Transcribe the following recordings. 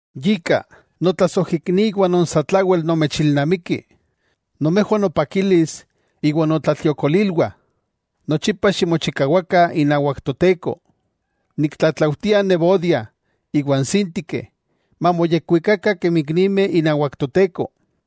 Yika, notlasojikniwah non satlawel nomechilnamikih, nomejwah nopakilis iwa notlatliokolilwah, nochipa ximochikawakah inawak Toteko. Niktlatlaujtia n Evodia iwa n Síntike mamoyekwikakah kemi iknimeh inawak Toteko.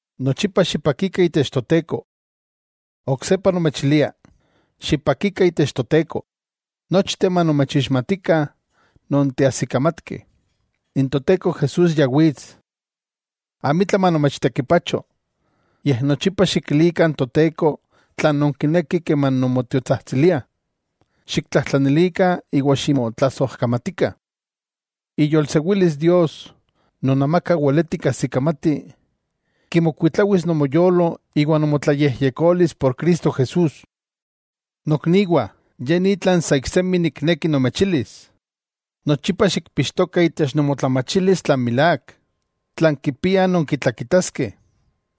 Nochipa xipakikah itech Toteko. Oksepa nomechilia: ¡Xipakikah itech Toteko! Nochteh manomechixmatikah non teajsikamatkeh. N Toteko Jesús ya wits. Amitla manomechtekipacho, yej nochipa xikilikah n Toteko tlan nonkinekih keman nonmotiotsajtsiliah, xiktlajtlanilikah iwa ximotlasojkamatikah. Iyolsewilis Dios, non amaka weleti kajsikamati, kimokuitlawis nomoyolo iwa nomotlayejyekolis por Cristo Jesús. Nokniwah, ye ni tlan sa iksemi nikneki nomechilis: nochipa xikpixtokah itech nomotlamachilis tlan milák, tlan kipia nonkitlakitaskeh,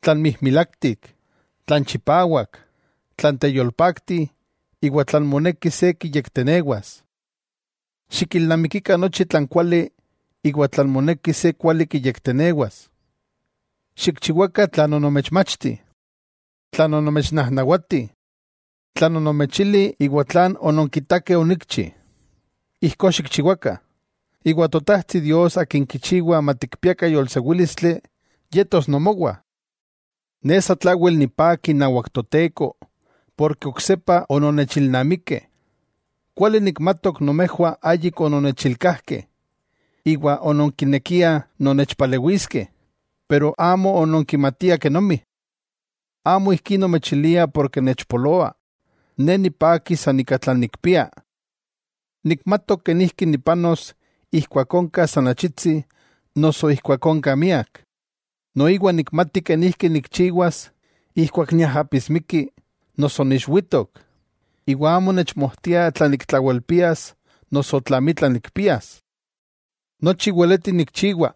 tlan mijmilaktik, tlan chipawak, tlan teyolpakti iwa tlan moneki se kiyektenewas. Xikilnamikikah nochi tlan kuali iwa tlan moneki se kuali kiyektenewas. Xikchiwakah tlan onomechmachti, tlan onomechnajnawati, tlan onomechili iwa tlan ononkitakeh onikchi: ijkó xikchiwakah, iwa Totajtsi Dios Akin kichiwa matikpiakah yolsewílistli, yetos nomowah. Ne satlawel nipaki inawak Toteko ken oksepa ononnechilnamikeh. Kuali nikmatok nomejwah ayik ononnechilkajkeh iwa ononkinekiah nonnechpalewiskeh, pero amo ononkimatiah kenomi. Amo ijkí nomechilia porke nechpoloa. Ne nipaki san ika tlan nikpia. Nikmatok kenijki nipanos ijkuak onka san achitsi noso ijkuak onka miak. Noiwa nikmati kenijki nikchiwas ijkuak niajapismiki noso niixwitok, iwa amo nechmojtia tla niktlawelpias noso tla amitla nikpias. Nochi weleti nikchiwa,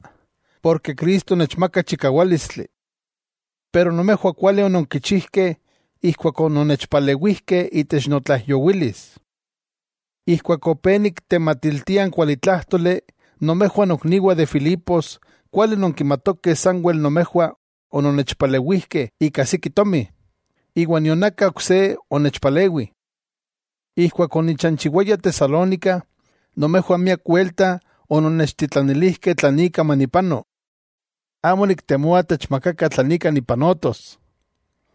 ken Cristo nechmaka chikawálistli. Maski ijkó nomejwah kuali ononkichijkeh ijkuak ononnechpalewijkeh itech notlaijyowilis. Ijkuak opé niktematiltia n kuali tlájtoli, nomejwah nokniwah de Filipos kuali nonkimatokeh sanwel nomejwah ononnechpalewijkeh ika siki tomi, iwa nion aka ok se onechpalewi. Ijkuak onichanchiwaya Tesalónica, nomejwah miak welta ononnechtitlanilijkeh tlan ika manipano. Amo niktemoa techmakakah tlan ika nipanotos,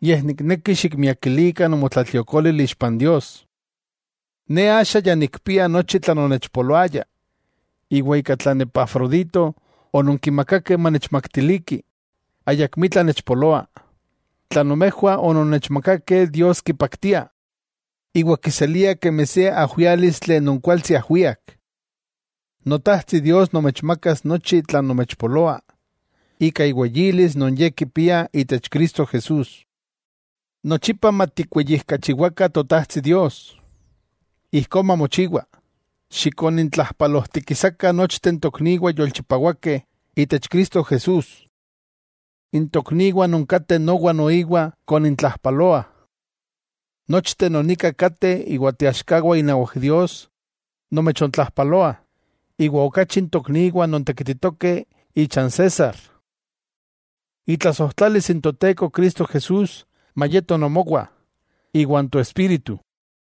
yej nikneki xikmiakilikah nomotlatliokolil ixpa n Dios. Ne axa ya nikpia nochi tlan onechpoloaya, iwa ika tlan Epafrodito ononkimakakeh manechmaktiliki, ayakmitla nechpoloa. Tlan nomejwah ononnechmakakeh Dios kipaktia, iwa kiselia kemi se ajwiálistli non kualtsi ajwiak. Notajtsi Dios nomechmakas nochi tlan nomechpoloa, ika iweyilis non Ye kipia itech Cristo Jesús. ¡Nochipa matikweyijkachiwakah Totajtsi Dios! Ijkó mamochiwa. Xikonintlajpalojtikisakah nochteh n tokniwah yolchipawakeh itech Cristo Jesús. N tokniwah non kateh nowa noiwa nomechtlajpaloah. Nochteh non nika kateh iwa teaxkawah inawak Dios, nomechontlajpaloah, iwa okachi n tokniwah non tekititokeh icha n César. Itlasojtlalis n Toteko Cristo Jesús mayeto nomowa iwan nomoespíritu.